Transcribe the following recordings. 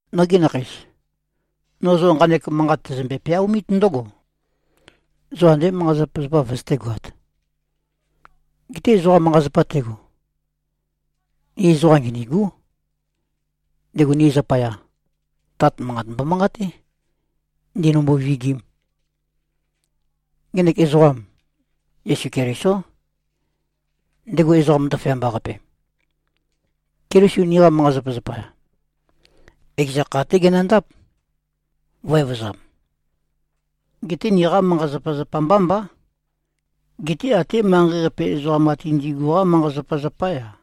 Nogi nakheis! No zo nqanek manqat tæzømbe-peaomít ndǿgo: Zo andé manqa-zapazapa vøzøtégoāt. Geté ezoqa manqa-zapa tego, ni ezoqa nginîgú. Ndego ni zapaya, Tat manqat mbomanqaté, ndīnīmbō-vīgīm. Ngenek ezoqam, Yesu Kelisó, ndego ezoqam ndaføyamba-qape. Keliso niqa manqa-zapazapa, ekeza kha-té genøndáp, vø̄-evøzam. Geté niqá manqa-zapazapa mbá mbá, geté até manqei-qape ezoqam ate ndigu-qá manqa-zapazapá-ya.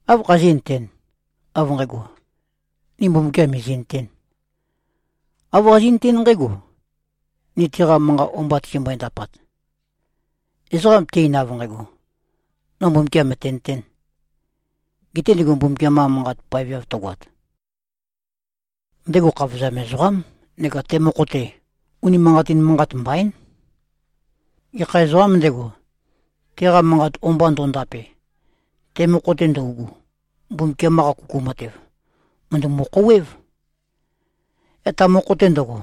Áv khazí꞉nøtēn, av nqægo, ni Mbumbukiam mìzi꞉nøtēn? Āv qazí꞉nøtén nqǽgo, ni teqa manqat o-mba tizimbøe-ndapat. Ezoqa te-ein, av nqægo, “No Mbumbukiam mø̀tenøtén,” gete ndego Mbumbukiam-qa Manqat paveav tøgoat, ndego khavozam ezoqám neka te mokho-te, unimanqatin manqat mbaín. Gekha ezoqām ndego, teqa manqat o-mba ndo꞉ndape, te mokho-te ndøugu, Mbumbukiam-qa kuku matev, mø̀ndømu-khouwév. Yaq ta mokho-te ndøgo,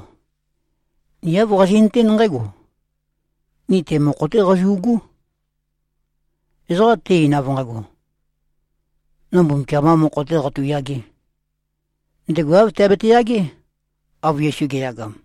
ni āv qazi꞉nøtén nqǽgo: Ni te mokho-té qazu꞉gú. Ezoqa te-ein, av nqægo, “No Mbumbukiam-qā mokho-tē qatu꞉yagē,” ndego āv teabete-yagé, av Yesu ge꞉yagam.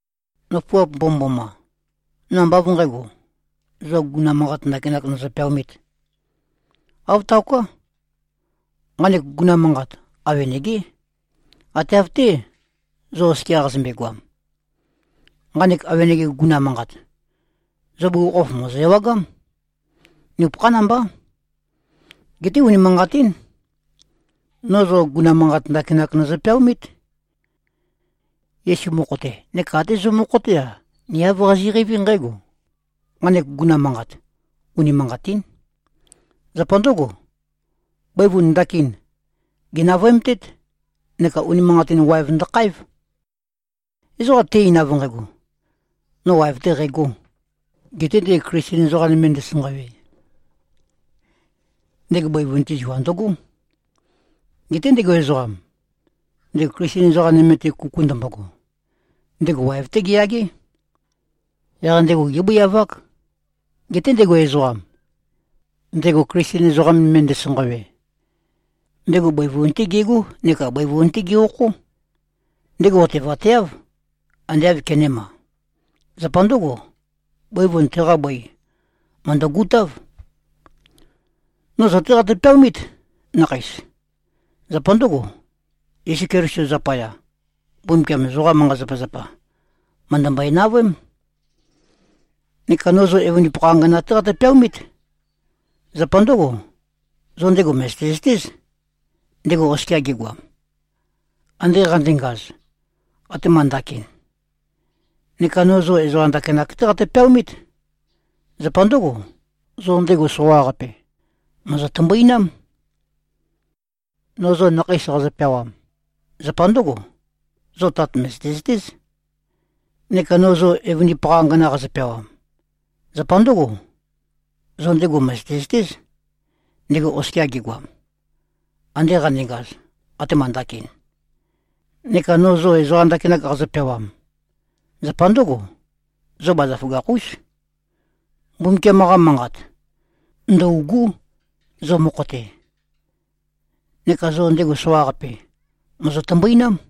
Nøfuap mbomømboma! No ambá av nqǣgo, zo guguna manqat ndakinak nøzø-peaomīt. Āv taoká. Nqanek guguna manqat, awenegé, ate av-té, zo oskia qazømbe-goam. Nqanek awenege guguna manqat, zo bugukhokhof mòzo-ewagám. Nupøkhán mbá. Geté unimanqatín. No zo guguna manqat ndakinak nøzø-peaomít. Yesu mokho-te, neka até zo mokho-té-a, ni āv qazi꞉qeiví nqǽgo: Nqanek guguna manqat, unimanqatín. Zapa ndǿgo, bøivun ndakin, gènavøemtét neka unimanqatin waev ndøkháev. Ezoqa te-ein, av nqægo, “No waev-tē qægō,” gete ndego Klisten ezoqa nøme ndesanqawe, ndego bøivun-te zua ndøgó. Geté ndego ezoqam, ndego Klisten ezoqa nøme-te kuku ndømbogo, ndego waev-té geyagé. Yaq ndego gébøiavák. Geté ndego ezoqam, ndego Klisten ezoqa nøme ndesanqawe, ndego bøivun-té gegó neka bøivun-té ge-okhó. Ndego otevateáv, ande āv kenēma. Zapa ndǿgo, bøivun teqa bøi, mø̀ndøgutáv. No zo-té qatø-peaomít, nakheis. Zapa ndǿgo, Yesu Keliso zapaya, Mbumbukiam zoqa manqa-zapazapa, mø̀ndømbøe-navøém. Neka no zo evøndipakha angana-té qatø-peaomít. Zapa ndǿgo, zo ndego mø̀zøte-zøtéz, ndego oskia gegoam, ande qandengaz, atema ndakin. Neka no zo ezoqa ndakinak-té qatø-peaomít. Zapa ndǿgo, zo ndego soqaqape, mòzo-tømbuinám. No zo nakheis qazø-peawam, zapa ndǿgo: Zo Tat mø̀zøte-zøtéz. Neka no zo evøndipakha angana qazø-peawam, zapa ndǿgo: Zo ndego mø̀zøte-zøtéz, ndego oskia gegoam, ande qandengaz, atema ndakin. Neka no zo ezoqa ndakinak qazø-peawam, zapa ndǿgo: Zo bazaføgakh-ús. Mbumbukiam-qa Manqat, ndø̂ugú, zo mokho-te. Neka zo ndego soqaqape, mòzo-tømbuinám.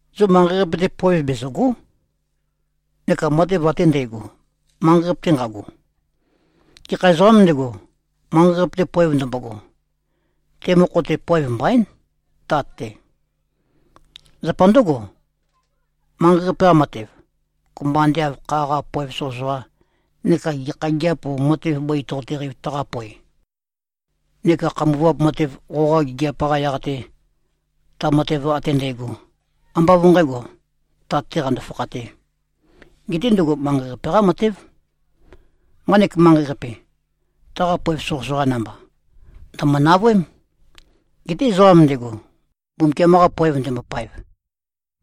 Zo manqei-qape-te poev bezø̀go᷄, neka matev ate ndægo, manqei-qape-te nqago. Gekha ezoqām ndego, manqei-qape-te poev ndømbogo, te mokho-te poev mbaín, Tat-te. Zapa ndǿgo, manqei-qape-qa matev, kopømba ande av kha-qa poev soqøsoqa, neka gekha gigiap o matev bøi toqoteqeiv taqapoe, neka khambuvap matev qoqa gigiap-qa yaq-te, ta matev ate ndægo, ambá av nqǣgo, Tat-tē qando-fakhatē. Geté ndøgo manqei-qape-qá matév. Nqanek manqei-qape, taqa poev soqøsoqa namba, ndø̀mø-navøém. Geté ezoqam ndego, Mbumbukiam-qa poev ndembopaev,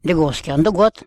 ndego oskia ndǿgoát.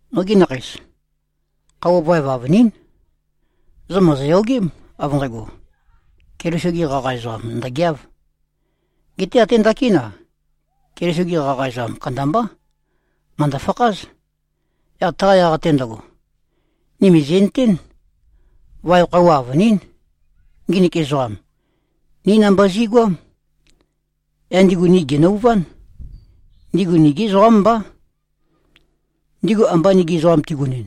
Nogi nakheis. Khøuwa vaev avønín. Zo mòzoyogém, av nqægo, Keliso-ge qaqa ezoqam ndø̀geáv. Geté até ndakín-a, Keliso-gi qaqa ezoqam kandambá, mø̀ndø-fakház. Yaq taqa yaq-te ndøgo, ni mìzi꞉nøtén, vaev khøuwa avønín. Nginik ezoqam, ní namba zi꞉goám. Yaq ndigu ni gènøuván. Ndigu nigí ezoqám mbá. Ndigu amba nigi ezoqam tigunɨn,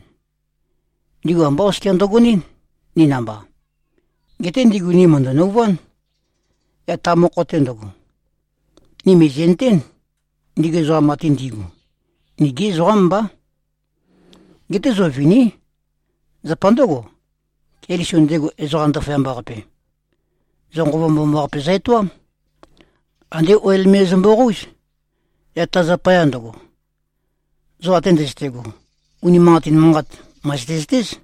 ndigu ambá oskia ndøgonɨ́n, ni namba. Geté ndigu ni mø̀ndø-nøuván. Yaq ta mokho-te ndøgo, ni mìzi꞉nøtén, ndigu ezoqam ate ndi꞉gu, nigí ezoqám mbá. Geté zo viní. Zapa ndǿgo, Keliso, ndego ezoqam ndaføyamba-qape, zo Nqova Mbomambaqape zø-etoám. Andé oil me zømbo-qóuz. Yaq ta zapaya ndøgo, zo ate ndøzøte꞉go, unimanqatin manqat, mø̀zøte-zøtéz.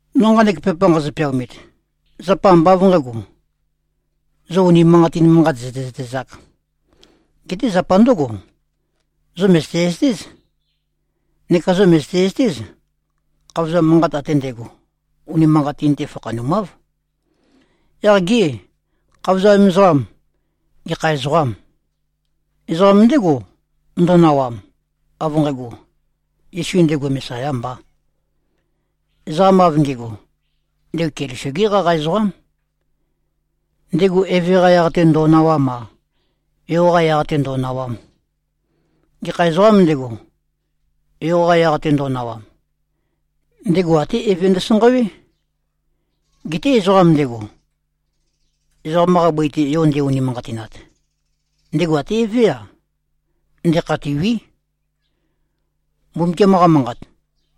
No nqanek pepa nqazø-peaomit, zapa ambá av nqǣgo, zo unimanqatin manqat zø̀tezøtezāk. Geté zapa ndǿgo: Zo mø̀zøte-zøtéz. Neka zo mø̀zøte-zøtéz, khavozam manqat ate ndægo, unimanqatin-te fakhanumáv. Yaq gê, khavozam ezoqam, gekha ezoqâm? Ezoqam ndégo, ndo꞉nawam, av nqægo, Yesu ndego Mesayā mbā. Ezoqam av nge꞉go, ndego Keliso-gé qaqa ezoqám. Ndego Eve-qa yaq-te ndō꞉nāwām-a, Yo-qa yaq-te ndō꞉nāwām. Gekha ezoqām ndego, Yo-qa yaq-te ndo꞉nawam, ndego até Eve ndøsanqawé. Geté ezoqa ndego, ezoqam-qa bøi-te Yo nde-unimanqatinat, ndego até Evé-a, ndekhatîwí. Mbumbukiam-qa Manqat,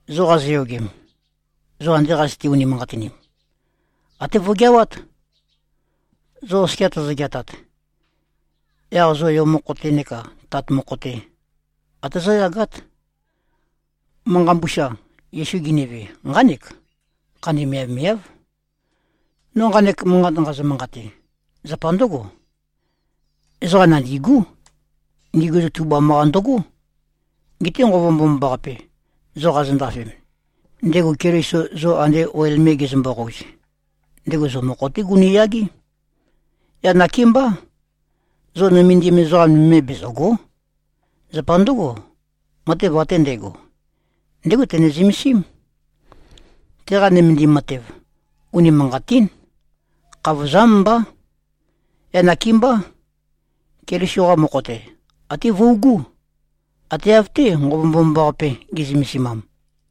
zo qazoyogem, zo ande qazøte-unimanqatinim, até vøgeawát. Zo oskia tozo-geatat, yaq zo Yo mokho-te neka Tat mokho-te, ate zóyagát. Manqa mbusa, Yesu ginive, nqánek: Khandi miavmiáv. No nqanek manqat nqazø-manqate, zapa ndǿgo: Ezoqa nandîgú. Ndigu zo tubam-qa ndøgó. Geté Nqova Mbomambaqape, zo qazondafem, ndego Keliso zo ande oil me gezømbo-qouz, ndego zo mokho-té gunu꞉yagé. Yaq nakémbá, zo nømendim ezoqa nøme bezø̀go᷄. Zapa ndǿgo, matev ate ndægo, ndégo tene-zømesím. Teqa nømendim matev, unimanqatín. Khavozám mbá. Yaq nakémbá, Keliso-qa mokho-te, até vøugú, ate av-té, Nqova Mbomambaqape ge꞉zømesimam.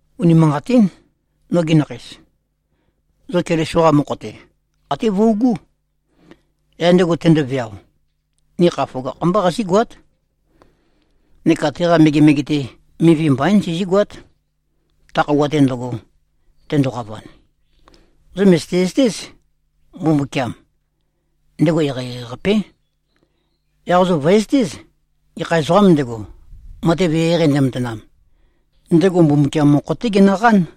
Unimanqatín, nogi nakheis. Zo Keliso-qa mokho-te, até vøugú. Yaq ndego tendoveao, ni kha føgakh-mbá qazígoát, neka teqa megemege-te, mivi mbaín, sizígoát, ta khøuwa-te ndøgo, tendoqavan. Zo mø̀zøte-zøtéz, Mbumbukiam, ndego eqeieqei-qapé. Yaq zo vø̀ezøtéz, gekha ezoqām ndego, matev eqeieqei ndematanam, ndego Mbumbukiam mokho-té genøqán.